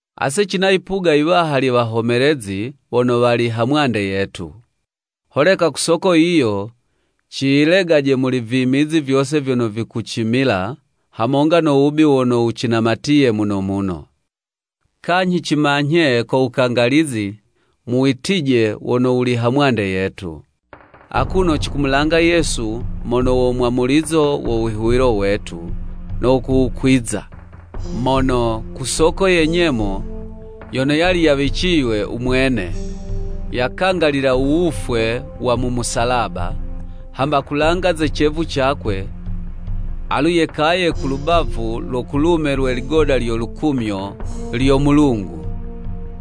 Ase cina yipuga yiwaha lye wahomelezi wono wali ha mwande yetu. Holeka ku soko yiyo ciyilegaje muli vimizi vyose vyono vikucimila, hamonga no wubi wono wucinamatiye muno muno. Kanyhi cimanyhe ko wukangalizi mu witije wono wuli ha mwande yetu. Akuno cikumulanga Yesu mono wo mwamulizo wo wihuwilo wetu, no kuwukwiza. Mono, ku soko ye nyemo yono yali yawiciywe u mwene, yakangalila u wufwe wa mu musalaba, hamba kulanga ze cevu cakwe, alu yekaye ku lubavu lo kulume lwe ligoda lyo lukumyo lyo Mulungu.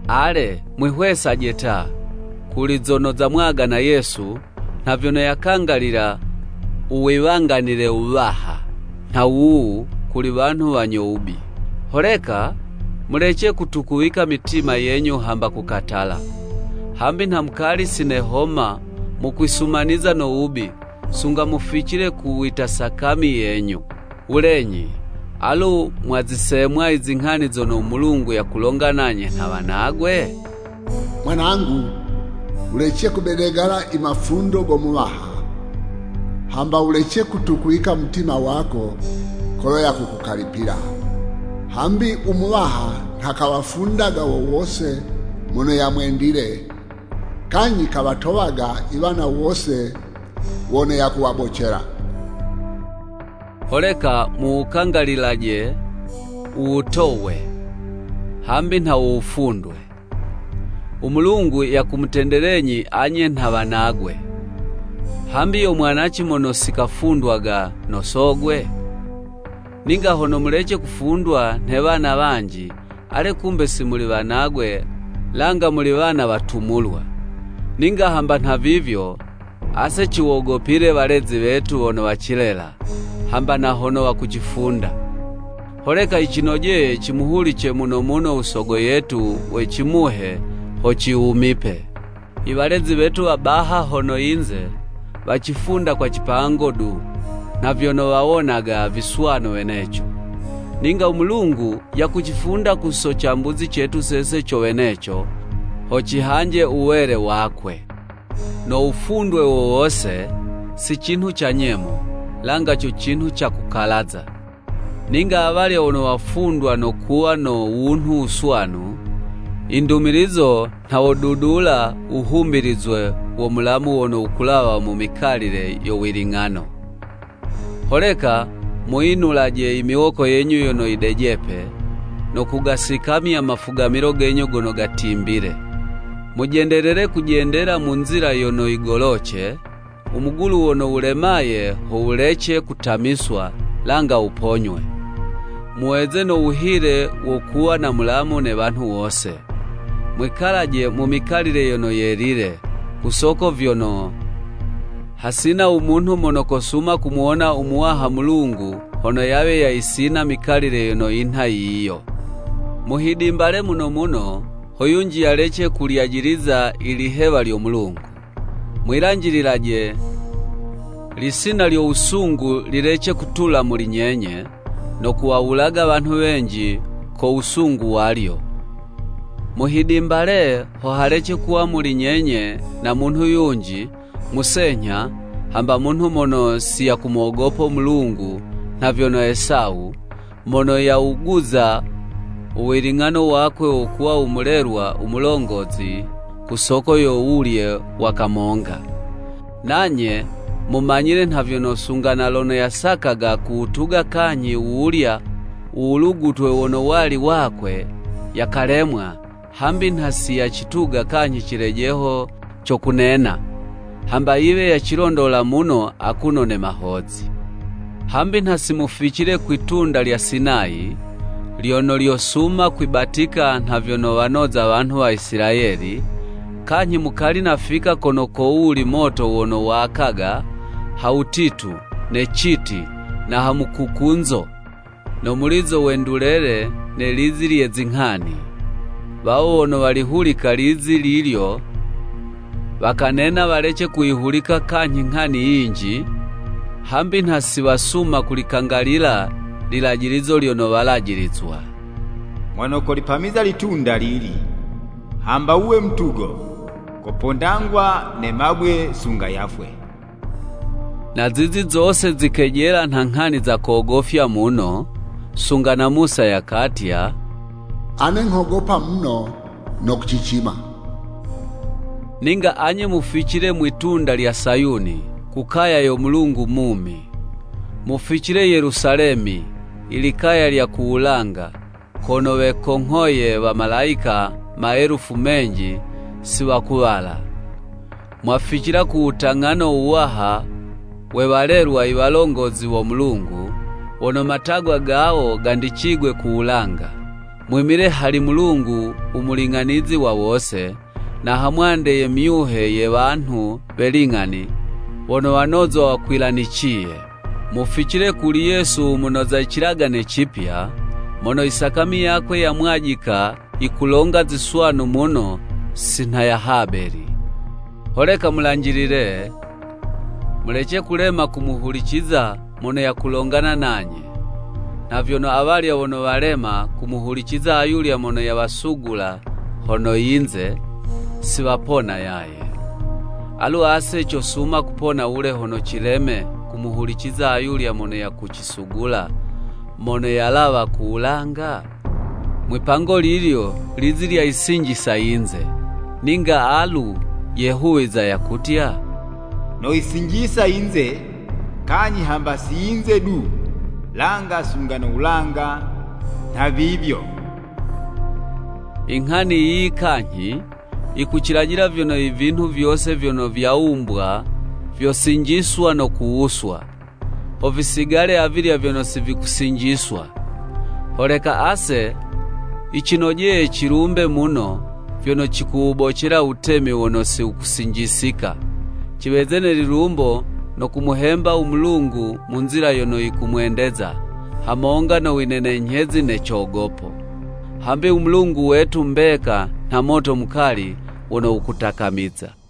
Ale, mwihwesaje ta, kuli zono zamwagana Yesu, nha vyono yakangalila u wiwanganile wuwaha nha wuwu kuli wanhu wanyo wubi. Holeka mulece kutukuwika mitima yenyu hamba kukatala. Hambi nha mukali si nehoma mukwisumaniza no wubi, sunga muficile ku wita sakami yenyu. Wulenyi, alu mwazisemwa i zinghani zono u Mulungu yakulonga nanye nha wanagwe? “Mwanangu, wulece kubedegala i mafundo go Muwaha, hamba wulece kutukuwika u mutima wako kolo yakukukalipila. Hambi u Muwaha nha kamufundaga wo wose mono yamwendile kanyhi kawatowaga iwana wose wono yakuwabocela.” Holeka muwukangalililaje u wutowe, hambi nha wo wufundwe; u Mulungu yakumutendelenyi anye nha wanagwe. Hambi yo mwanaci mono si kafundwaga no sogwe? Ninga hono mulece kufundwa nhe wana wanji, ale kumbe si muli wanagwe, langa muli wana watumulwa. Ninga hamba nhavivyo, ase ciwogopile walezi wetu wono wacilela, hamba na hono wakucifunda. Holeka yicinojeye cimuhulice muno muno u Sogo yetu we cimuhe ho ciwumipe. I walezi wetu wa baha hono yinze, wacifunda kwa cipango du, nha vyono wawonaga viswanu weneco, ninga u Mulungu yakucifunda ku so cambuzi cetu sese co weneco, ho cihanje u wele wakwe. No wufundwe wo wose, si cinhu ca nyemo, langa co cinhu ca kukalaza. Ninga awalya wono wafundwa no kuwa no wunhu wuswanu, i ndumilizo nha wodudula wuhumbilizwe wo mulamu wono wukulawa mu mikalile yo wiling'ano! Holeka muyinulaje i miwoko yenyu yono yidejepe, no kugasikamya mafugamilo genyu gono gatimbile. Mujendelele kujendela mu nzila yono yigoloce, u mugulu wono wulemaye ho wulece kutamiswa, langa wuponywe. Muweze no wuhile wo kuwa na mulamu ne wanhu wose. Mwikalaje mu mikalile yono yelile, ku soko vyono, hasina u munhu mono kosuma kumuwona u Muwaha Mulungu, hono yawe yayisina mikalile yono yinha yiyo. Muhidimbale muno muno, ho yunji yalece kulyajiliza i lihewa lyo Mulungu. Mwilanjililaje, lisina lyo wusungu lilece kutula muli nyenye, no kuwawulaga wanhu wenji ko wusungu walyo. Muhidimbale, ho halece kuwa muli nyenye na munhu yunji, musenyha hamba munhu mono si yakumogopo Mulungu nha vyono Esawu, mono yawuguza u wiling'ano wakwe wo kuwa u mulelwa u mulongozi ku soko yo wulye wa kamonga. Nanye mumanyile nha vyono, sunga na lono yasakaga kuwutuga kanyhi wuwulya u wulugutwe wono wali wakwe, yakalemwa, hambi nha si yacituga kanyhi cilejeho co kunena, hamba yiwe yacilondola muno akuno ne mahozi. Hambi nha simuficile kwi'tunda lya Sinayi, lyono lyosuma kwibatika nha vyono wanoza wanhu wa Isilayeli, kanyhi mukali nafika kono kowuli moto wono wakaga, ha wutitu, ne citi, na ha mukukunzo, no mulizo we ndulele ne lizi lye zinghani. Wawo wono walihulika lizi lilyo, wakanena walece kuyihulika kanyhi nghani yinji, hambi nha si wasuma kulikangalilila lilajilizo lyono walajilizwa. “Mono kolipamiza litunda lili hamba wuwe mutugo, kopondangwa ne mabwe sunga yafwe.” Na zizi zose zikejela nha nghani za kogofya muno, sunga na Musa yakatya, “Ane nghogopa muno no kucicima.” Ninga anye muficile mwi'tunda lya Sayuni, ku kaya yo Mulungu mumi. Muficile Yelusalemi, ilikaya lya ku wulanga, kono wekonghoye wa malayika maelufu menji si wakuwala. Mwaficila ku wutang'ano wuwaha we walelwa iwalongozi wo Mulungu, wono matagwa gawo gandicigwe ku wulanga. Mwimile hali Mulungu u muling'anizi wa wose, na hamwande ye myuhe ye wanhu we ling'ani wono wanozwa wakwilaniciye. Muficile kuli Yesu u munoza i Cilagane, Cipya mono i sakami yakwe yamwajika yikulonga ziswanu muno si nha ya Habeli. Holeka mulanjilile, mulece kulema kumuhuliciza mono yakulongana nanye. Nha vyono awalya wono walema kumuhuliciza ayulya mono yawasugula hono yinze, si wapona yaye. Alu ase cosuma kupona wule hono cileme kumuhuliciza ayulya mono yakucisugula, mono yalawa ku wulanga? Mwi'pango lilyo lizi lyayisinjisa yinze, ninga alu yehuwiza yakutya, “Noyisinjisa yinze, kanyhi hamba si yinze du langa sunga no wulanga nhavivyo.” I nghani yiyi kanyhi, yikucilajila vyono i vinhu vyose vyono vyawumbwa vyosinjiswa no kuwuswa, ho visigale avilya vyono si vikusinjiswa. Holeka ase, yicinojeye cilumbe muno, vyono cikuwubocela u wutemi wono si wukusinjisika. Ciweze ne lilumbo no kumuhemba u Mulungu mu nzila yono yikumwendeza, hamonga no winenenyhezi ne cogopo; hambi u Mulungu wetu mbeka nha moto mukali wono wukutakamiza.